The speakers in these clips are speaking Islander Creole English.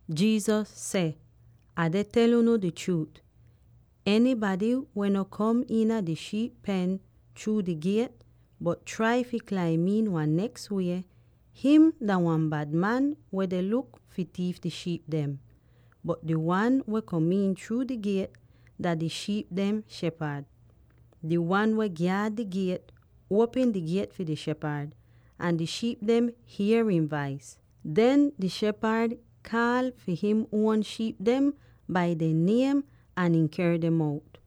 Jesus seh, “Ah deh tel unu di chruut: enybady weh no kom iina di shiip pen chruu di giet, bot trai fi klaim iin wan neks wie, him dah wan bad man weh deh luk fi tiif di shiip dem. Bot di wan weh kom'in chruu di giet, dah di shiip dehn shepad. Di wan weh gyaad di giet, uopm di giet fi di shepad, ahn di shiip dem hier ihn vais. Den di shepad kaal fi him uon shiip dem bai dehn niem ahn ihn ker dem out.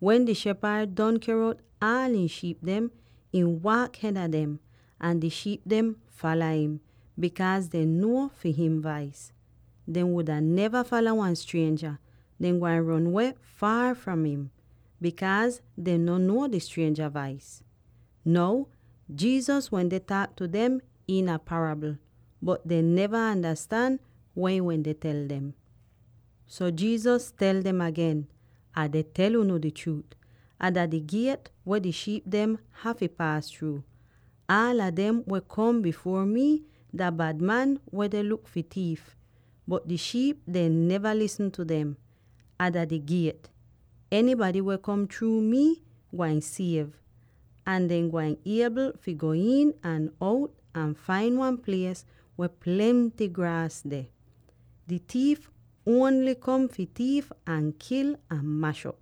Wen di shepad don ker out aal ihn shiip dem, ihn waak hed a dem, ahn di shiip dem fala im, bikaaz dehn nuo fi him vais. Dehn wuda neva fala wan strienja; dehn gwain ron weh faar fahn im, bikaaz dehn no nuo di strienja vais.” Now, Jesus wende taak tu dem iina parabl, bot dehn neva andastan weh ihn wende tel dem. So Jesus tel dem agen, “Ah deh tel unu di chruut: Ah dah di Giet weh di shiip dem hafy paas chruu. Aala dem weh kom bifuor mi dah bad man weh deh luk fi tiif, bot di shiip dehn neva lisn tu dem. Ah dah di Giet; enybady weh kom chruu mii gwain siev, ahn dehn gwain iebl fi go iin ahn out ahn fain wan plies weh plenty graas deh. Di tiif ongl kom fi tiif ahn kil ahn mash'op.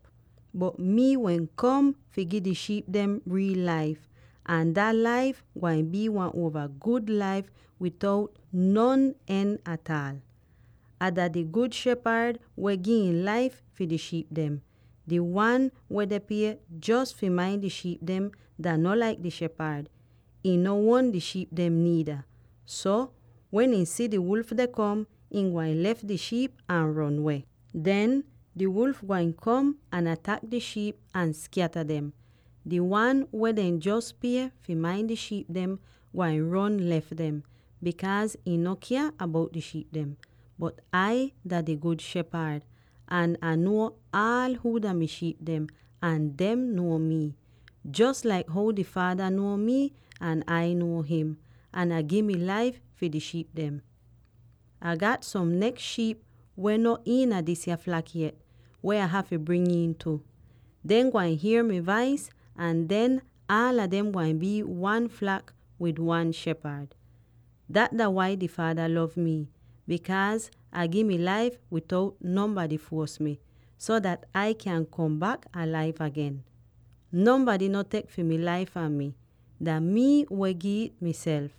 Bot mii wehn kom fi gi di shiip dem riil laif, ahn dat laif gwain bii wan uova gud laif bitout non en ataal! “Ah dah di Gud Shepad weh gi ihn laif fi di shiip dem. Di wan weh dehn pie jos fi main di shiip dem dah no laik di shepad; ihn no uon di shiip dem niida. So, wen ihn si di wulf deh kom, ihn gwain lef di shiip ahn ron weh. Den, di wulf gwain kom ahn atak di shiip ahn skyata dem. Di wan weh dehn jos pie fi main di shiip dem gwain ron lef dem, bikaaz ihn no kya bout di shiip dem. Bot Ai dah di Gud Shepad, ahn Ah nuo aal huu dah mi shiip dem, ahn dehn nuo mii, jos laik how di Faada nuo mii ahn Ah nuo him. Ahn Ai gi mi laif fi di shiip dem. “Ah gat som neks shiip, weh no iina disya flak yet, weh Ah hafy bring iin tu. Dehn gwain hier mi vais ahn den aala dem gwain bii wan flak wid wan shepad. Dat dah wai di Faada lov mii, bikaaz Ah gi mi laif bitout nonbady fuos mi, so dat Ai kyan kom bak alaiv agen. Nonbady no tek fi mi laif fahn mi; dah mii weh giv it miself.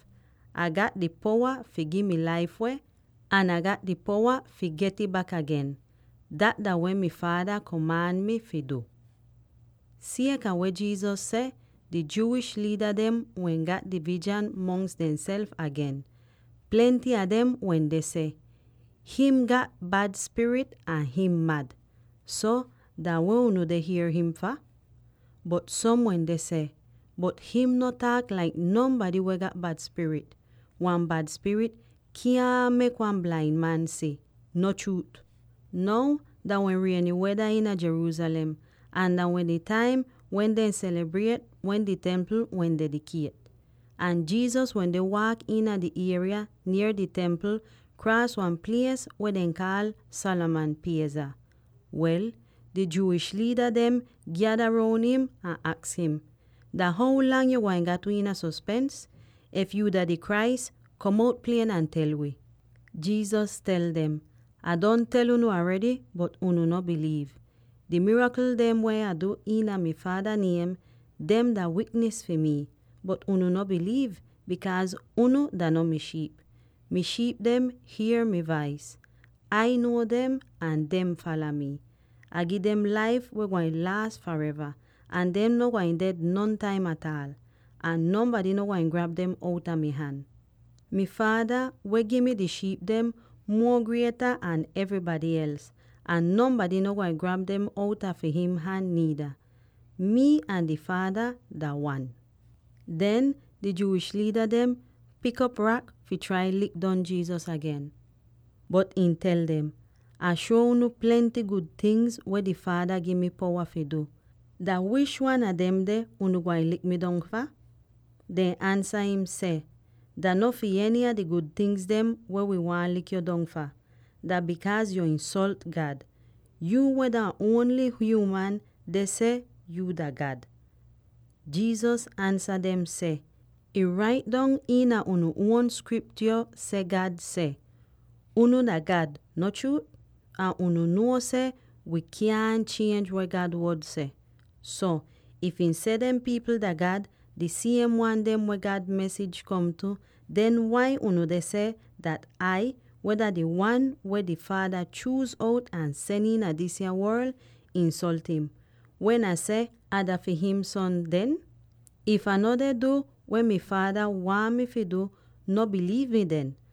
Ah gat di powa fi gi mi laif weh, ahn Ah gat di powa fi get'ih bak agen. Dat dah weh mi Faada komaan mii fi du.” Sieka weh Jesus seh, di Jewish liida dem wehn gat divizhan mongs dehnself agen. Plenty a dem wende seh, “Him gat bad spirit ahn ihn mad! So, dah weh unu deh hier him fah?” Bot som wende seh, “Bot him no taak laik nonbady weh gat bad spirit. Wan bad spirit kyaahn mek wan blain man si, no chruut?” Now dah wehn rieny weda iina Jerusalem, ahn dah wehn di taim wen dehn selibriet wen di Templ wehn dedikiet. Ahn Jesus wende waak iina di ieriya nier di Templ, kraas wan plies weh dehn kaal Solomon Pieza. Wel, di Jewish liida dem gyada roun im ahn aks im, “Dah how lang yo gwain gat wi iina sospens? If yuu dah di Christ, kom out klier ahn tel wi!” Jesus tel dem, “Ah don tel unu aredy, bot unu no biliiv. Di mirakl dem weh Ah du iina mi Faada niem, dem dah wiknis fi mi. Bot unu no biliiv, bikaaz unu dah no mi shiip. Mi shiip dem hier mi vais; Ah nuo dem, ahn dehn fala mii. Ah gi dem laif weh gwain laas fareva, ahn dehn no gwain ded nontaim ataal. Ahn nonbady no gwain grab dem outa mi han. Mi Faada, weh gi mi di shiip dem, muo grieta an evrybady els, ahn nonbady no gwain grab dem outa fi him han niida. Mii ahn di Faada dah wan.” Den di Jewish liida dem pik op rak fi trai fi lik dong Jesus agen, bot ihn tel dem, “Ah shuo unu plenty gud ting weh di Faada gi mi di powa fi du. Dah wish wan a demde unu gwain lik mi dong fah?” Dehn ansa im seh, “Dah no fi eny a di gud tingz wi waahn lik yo dong fah. Dah bikaaz yo insolt God; yuu weh dah ongl hyuuman, deh seh yuu dah God!” Jesus ansa dem seh, “Ih rait dong iina unu uon Skriptyo seh God seh, ‘Unu dah gad,’ no chruut? Ahn unu nuo seh wi kyaahn chienj weh God Wod seh. So, if ihn seh dem pipl dah gad —di siem wan dem weh God mesij kom tu— den wai unu deh seh Ai dah di Wan, weh di Faada chuuz out ahn sen iina disa worl, insolt im, wen Ah seh ‘Ah dah fi him Son,’ den? If Ah no deh du weh mi Faada waahn mi fi du, no biliiv mi den.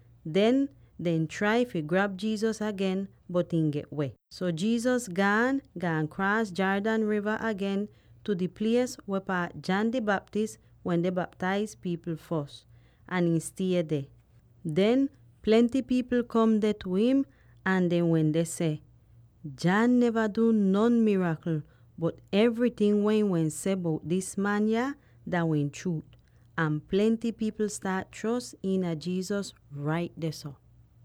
Den, dehn trai fi grab Jesus agen, bot ihn get-weh. So Jesus gaan, gaan kraas Jordan riva agen tu di plies weh paat John di Baptist wende baptaiz pipl fos. Ahn ihn stie deh. Den plenty pipl kom deh tu im, ahn dehn wende seh, “John neva du non mirakl, bot evryting weh ihn wehn seh bout dis man yah dah wehn chruut.” Ahn plenty pipl staat chros iina Jesus rait dehso.